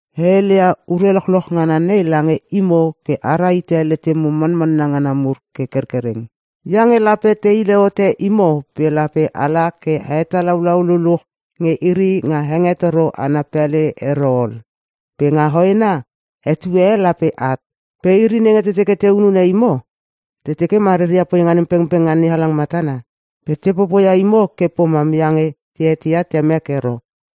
“E heleia ure lochloch ngana nei lange imo ke a rahite letemo manmanna ngana mur ke kerkereng. Iange lape te hile hote imo pe lape ala ke a hetalaulau luluch nge iri nga hengetoro ana pele ero ol. Pe nga hoena etue e lape at. Pe iri nenge te teke te hunune imo, te teke ma reria poinga nem pengpeng nga NeHalang matana. Pe te popoia imo ke pomam iange te eteia Temek ero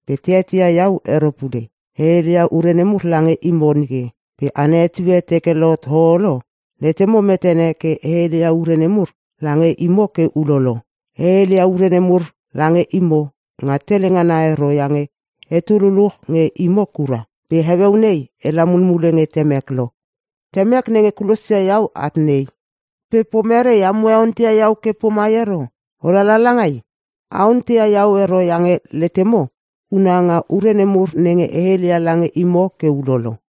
pe te eteia iau ero pule. E heleia ure nemur lange imo nike. Pe ana etue teke lohot ho olo, letemo metene ke e heleia ure nemur lange imo ke ulolo. E heleia ure nemur lange imo nga tele ngana ero iange etu luluch nge imo kura. Pe heueu nei ela mulmule nge Temek lo. Temek nenge kulosia iau at nei. Pe pomerei amo e onteia iau ke pomai ero? ‘O lala langai?’ A onteia iau ero iange letemo una nga ure nemur nenge e heleia lange imo ke ulolo.”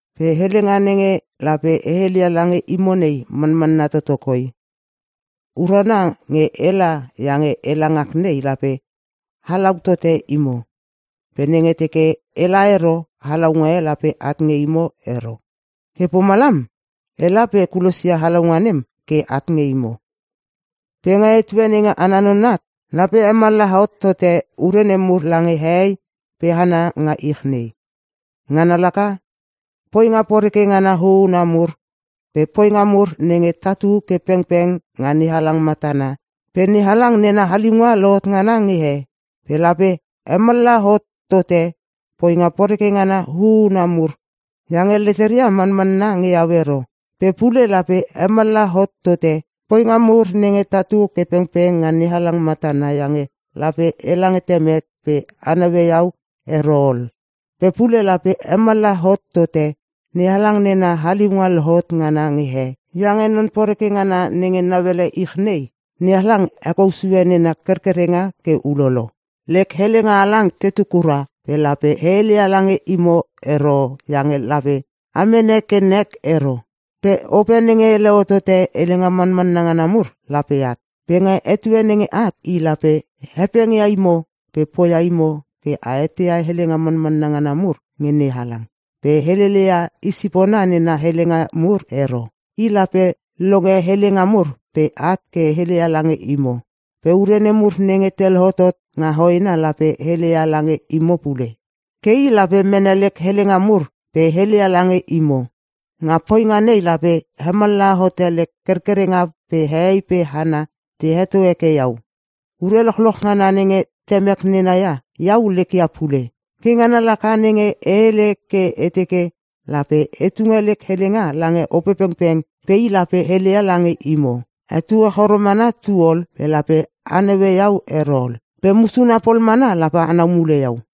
“Pe helenga nenge lape e heleia lange imo nei manmanna toto koi. Urana nge ela iange ela ngak nei lape halau tote imo. Pe nenge teke ela ero halaunga e lape at nge imo ero. Ke pomalam ela pe e kulosia halaunga nem ke at nge imo. Pe nga etue nenge ana non at, lape hemallaha hot tote ure nemur lange hehei pe hana nga ich nei. Ngana laka; Poinga poreke ngana huuna mur pe poinga mur nenge tatu ke pengpeng nga NeHalang matana pe NeHalang nena haliunga lohot ngana nge he. Pe lape hemallaha hot tote poinga poreke ngana hu una mur iange leteria manmanna nge iau ero. Pe pule lape hemallaha hot tote poinga mur nenge tatu ke pengpeng nga NeHalang matana iange lape ela nge Temek pe a naue iau ero ol. Pe pule lape hemallaha hot tote NeHalang nena haliunga lohot ngana nge he iange non poreke ngana nenge nauele ich nei, NeHalang hekou sue nena kerkerenga ke ulolo. “Lek helenga halang tetu kura pe lape e heleia lange imo ero iange lape a mene ke nek ero. Pe Ope nenge hele hotote helenga manmanna ngana mur lape at. Pe nga etue nenge at i lape hepengia imo pe poia imo ke a eteia helenga manmanna ngana mur nge NeHalang. Pe helele ia i sipona nena helenga mur ero. I lape longe helenga mur pe at ke heleia lange imo. Pe ure nemur nenge te lohotot nga hoena lape heleia lange imo pule. Ke i lape mene lek helenga mur pe heleia lange imo. Nga poinga nei lape hemallaha hote lek kerkerenga pe hehei pe hana te heto heke iau. Ure lochloch ngana nenge Temek nena ia iau lek ia pule. Ke ngana laka nenge e hele ke e teke lape e tunge lek helenga lange Opepengpeng pe i lape heleia lange imo. “Etue choro mana tu ol pe lape a naue iau ero ol. Pe musuna pol mana lape anau mule iau.”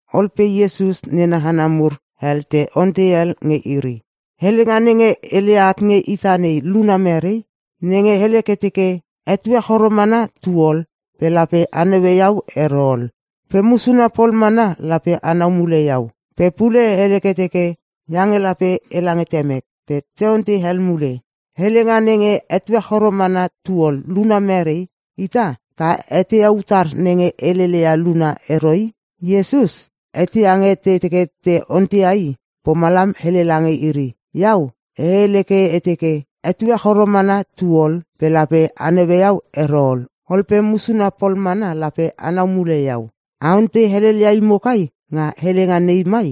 Ol pe Iesus nena hana mur hel te ontei hel nge iri, “Helenga nenge heleia at nge ita nei luna merei? Nenge hele ke teke, ‘Etue choro mana tu ol pe lape a naue iau ero ol. Pe musuna pol mana lape anau mule iau.’ Pe pule hele ke teke, ‘Iange lape ela nge Temek’.” Pe te ontei hel mule, “Helenga nenge, ‘Etue choro mana tu ol’ luna merei? Ita ta eteia utar nenge helele ia luna ero i.” Iesus eteia nge te teke te onteia i. Pomalam hele lange iri, “Iau e hele ke e teke, ‘Etue choro mana tu ol pe lape a naue iau ero ol pe musuna pol mana lape anau mule iau.’ A ontei helelia imo kai nga helenga nei mai?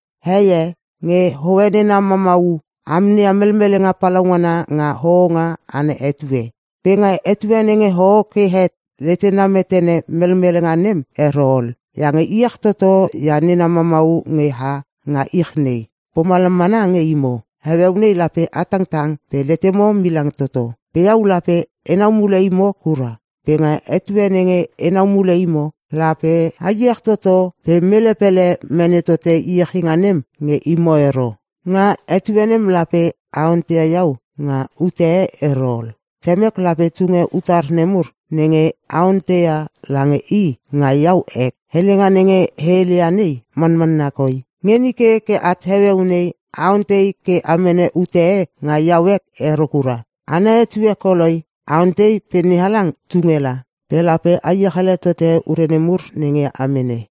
Hei e nge hoe nena mamau a amneia melmelenga palaungana nga hohonga ana etue. Pe nga etue nenge hoho ke het letena metene melmelenga nem ero ol, iange iech toto ia nena mamau nge ha nga ich nei. Pomalam mana nge imo. Heueu nei lape a tangtang pe letemo milang toto. Pe iau lape enau mule imo kura. Pe nga etue nenge enau mule imo lape a iech toto pe mele pele mene tote iechinga nem nge imo ero. Nga etue nem lape a onteia iau nga ute ero ol. Temek lape tunge utar nemur nenge a onteia lange i nga iau ek. Helenga nenge e heleia nei manmanna koi. Nge nike ke at heueu nei a ontei ke a mene ute e nga iau ek ero kura. Ana etue at koloi. A ontei pe NeHalang tunge la. Pe lape a iech ele tote ure nemur nenge a mene.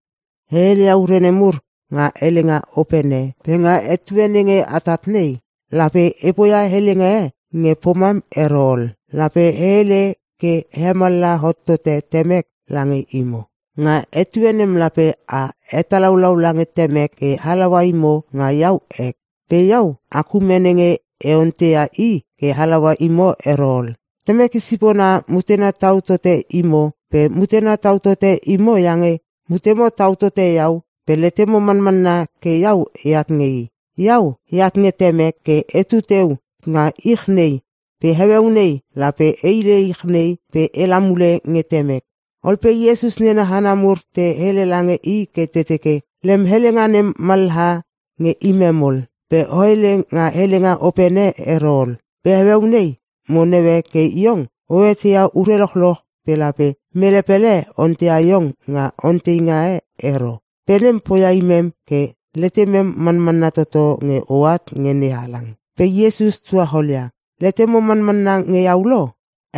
“E heleia ure nemur nga helenga opene pe nga etue nenge atat nei, lape e poia helenga e nge pomam ero ol. Lape e hele ke e hemallaha hot tote Temek lange imo. Nga etue nem lape a hetalaulau lange Temek ke halaua imo nga iau ek. Pe iau ak ume nenge e onteia i ke halaua imo ero ol. Temek i sipona mutena tau tote imo pe mutena tau tote imo iange, mutemo tau tote iau pe letemo manmanna ke iau eat nge i. Iau, eat nge Temek ke etu teu nga ich nei pe heueu nei lape e hile ich nei pe ela mule nge Temek.” Ol pe Iesus nena hana mur te hele lange i ke te teke, “Lem helenga nem mallaha nge imem ol. Pe o hele nga helenga opene ero ol. Pe heueu nei mo naue ke iong o eteia ure lochloch pe lape mele pele onteia iong nga onteinga e ero. Pe nem poia imem ke letemem manmanna toto nge oat nge NeHalang.” Pe Iesus tuacholia, “Letemo manmanna nge iau lo?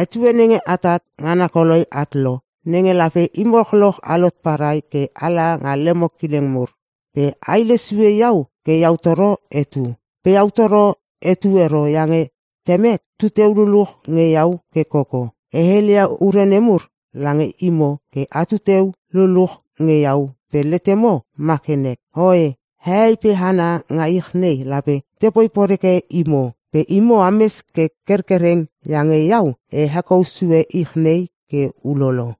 Etue nenge atat ngana koloi at lo nenge lape imo lochloch alot parai ke ala nga lemo kileng mur. Pe a hilesue iau ke iau toro etu. Pe iau toro etu ero iange Temek tu teu luluch nge iau ke koko.” “E heleia ure nemur lange imo ke atu teu luluch nge iau pe letemo ma ke nek. Oe, hehei pe hana nga ich nei lape tepoi poreke imo. Pe imo ames ke kerkereng iange iau e hekou sue ich nei ke ulolo.”